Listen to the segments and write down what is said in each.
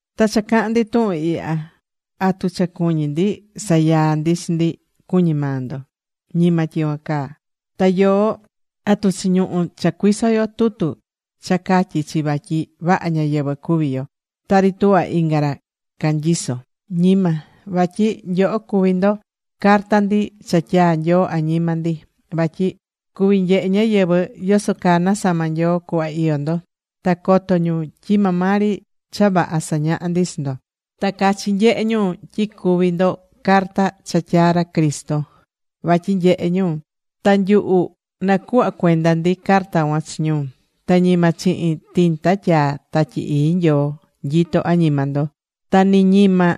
Ta cha cahán ndi tuhun ihya, ¿atu cha cuñí ndi sayaa ndi chi ndi, cuñí maa ndo? Ñima tyicuan caa. Ta yoó ¿atu chiñuhú cha cuiso yo tutu cha catyí chi vatyi vaha ñáyɨvɨ cuví yo, tari tuhva inga ra canyiso? Ñima. Vatyi nyoho cuví ndo carta ndi cha tyaa̱ Nyoo añima ndi. Vatyi cuví nyehe ñáyɨvɨ yoso caa nasama̱ Nyoo cuhva iyó ndo. Ta coto ñu tyi maa maa ri cha vaha sañahá ndi chi ndo. Ta cachi nyehé ñu tyi cuví ndo carta cha tyaa̱ ra Cristo vatyi nyehe ñu, ta nyuhu nacuhva̱ cuenda ndi carta cuan chi ñu. Ta ñima chihin tinta tyaa̱ Tatyi Ii Nyoo nyitó añima ndo. Ta ni ñima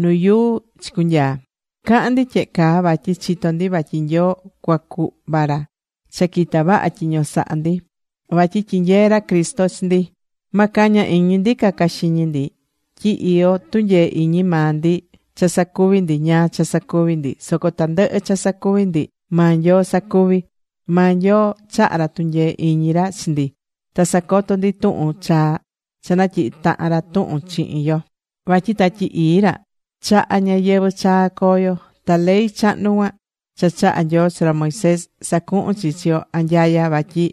nu yuu chicunyaa. Cahán ndi tyehe caa vatyi chitó ndi vatyi Nyoo cuacuhva ra cha quita vaha tyiño sahá ndi. Vatyi tyinyeé ra Cristo chi ndi. Ma caña iñi ndi caca xiñi ndi tyi iyó tunyee iñi maa ndi cha sacuví ndi ñáá cha sacuví ndi. Soco tandɨhɨ cha sacuví ndi maa Nyoo sacuví. Maa Nyoo chahá ra tunyee iñi ra chi ndi, ta sacotó ndi tuhun chaa cha natyihi̱ tahan ra tuhun chihin yo. Vatyi Tatyi Ii ra chahá ñayɨvɨ̱ chaa coo yo. Ta ley chahnu cuan cha chaha̱ Nyoo chi ra Moisés, sacuhún chi chi yo anyaya vatyi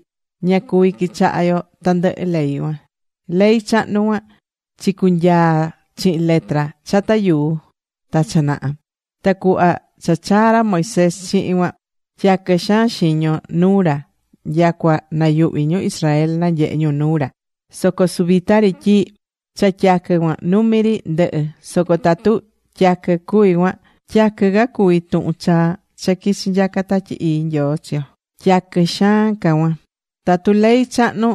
ña cuví quichaha yo tandɨhɨ ley cuan. Ley chahnu cuan, chicunyaa chihin letra chata yuu ta cha naha. Ta cuhva cha chaa̱ ra Moisés chihin cuan, tyaquɨ xaan xiño nuu ra nyacua nayuhví ñu Israel nanyehe̱ ñu nuu ra. Soco suvita ri tyi cha tyaquɨ cuan numi ri ndɨhɨ̱. Soco tatu tyaquɨ cuvi̱ cuan, tyaquɨ ca cuví tuhun chaa cha quichi̱ nyaca Tatyi Ii Nyoo chi yo. Tyaquɨ xaan ca cuan. Tatu ley chahnu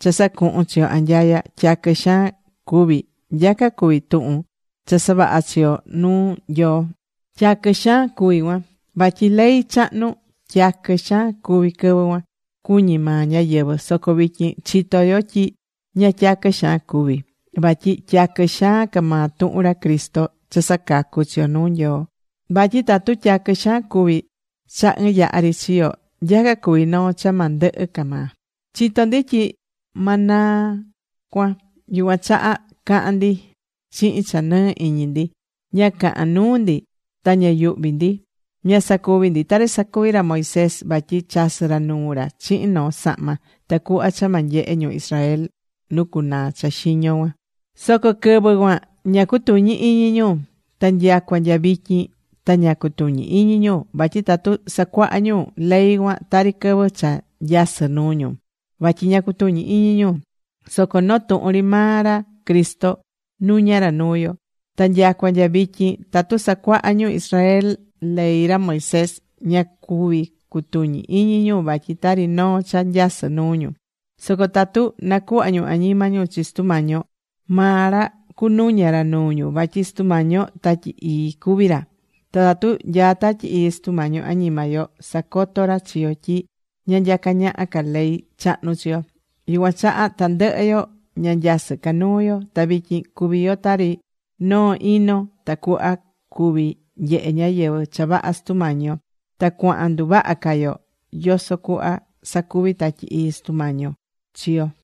cha sacuhún chi yo anyaya, tyaquɨ xaan cuvi̱, nyaca cuví tuhun cha saváha chi yo nuu Nyoo. Tyaquɨ xaan ca cuví cuan. Vatyi ley chahnu tyaquɨ xaan cuvi̱ quɨvɨ cuan, cuñí maa ñáyɨvɨ. Soco vityin chitó yo tyi ña tyaquɨ xaan cuvi̱. Vatyi tyaquɨ xaan ca maa tuhun ra Cristo cha sacacú chi yo nuu Nyoo. Vatyi tatu tyaquɨ xaan cuvi̱ cha ɨɨn yaha ri chiyo̱, nyaca cuví noo cha ma ndɨhɨ ca maa. Chitó ndi tyi ma naa cuan. Yucuan chaha cahán ndi chihin cha nɨɨ iñi ndi. Ña cahán nuu ndi ta ña yuhví ndi. Ña sacuví ndi tari sacuvi̱ ra Moisés. Vatyi chasɨ̱ ra nuu ra chihin noo sahma, tacuhva cha ma nyehe ñu Israel nu cunaa cha xiño cuan. Soco quɨvɨ cuan ña cutuñí iñi ñu. Ta nyacua nya vityin ta ña cutuñí iñi ñu. Vatyi tatu sacuahá ñu ley cuan tari quɨvɨ cha nyasɨ́ nuu ñu. Vatyi ña cutuñí iñi ñu. Soco noo tuhun ri maa ra Cristo nuñá ra nuu yo. Ta nyacua nya vityin tatu sacuahá ñu Israel ley ra Moisés, ña cuví cutuñi iñi ñu. Vatyi tari noo cha nyasɨ́ nuu ñu. Soco tatu nacuhvá ñu añima ñu chi Sutu Mañi yo, maa ra cunuña ra nuu ñu. Vatyi Sutu Mañi yo, Tatyi Ii cuví ra. Ta tatu nyaá Tatyi Ii Sutu Mañi yo añima yo, sacotó ra chi yo tyi ña nyacá ñaha ca ley chahnu chi yo. Yucuan chaha tandɨhɨ yo ña nyasɨ́ ca nuu yo. Ta vityin cuví yo tari noo ino, tacuhva cuví nyehe ñáyɨvɨ cha vaha Sutu Mañi yo. Ta cuahán nduvaha ca yo yoso cuhva sacuví Tatyi Ii Sutu Mañi yo chi yo.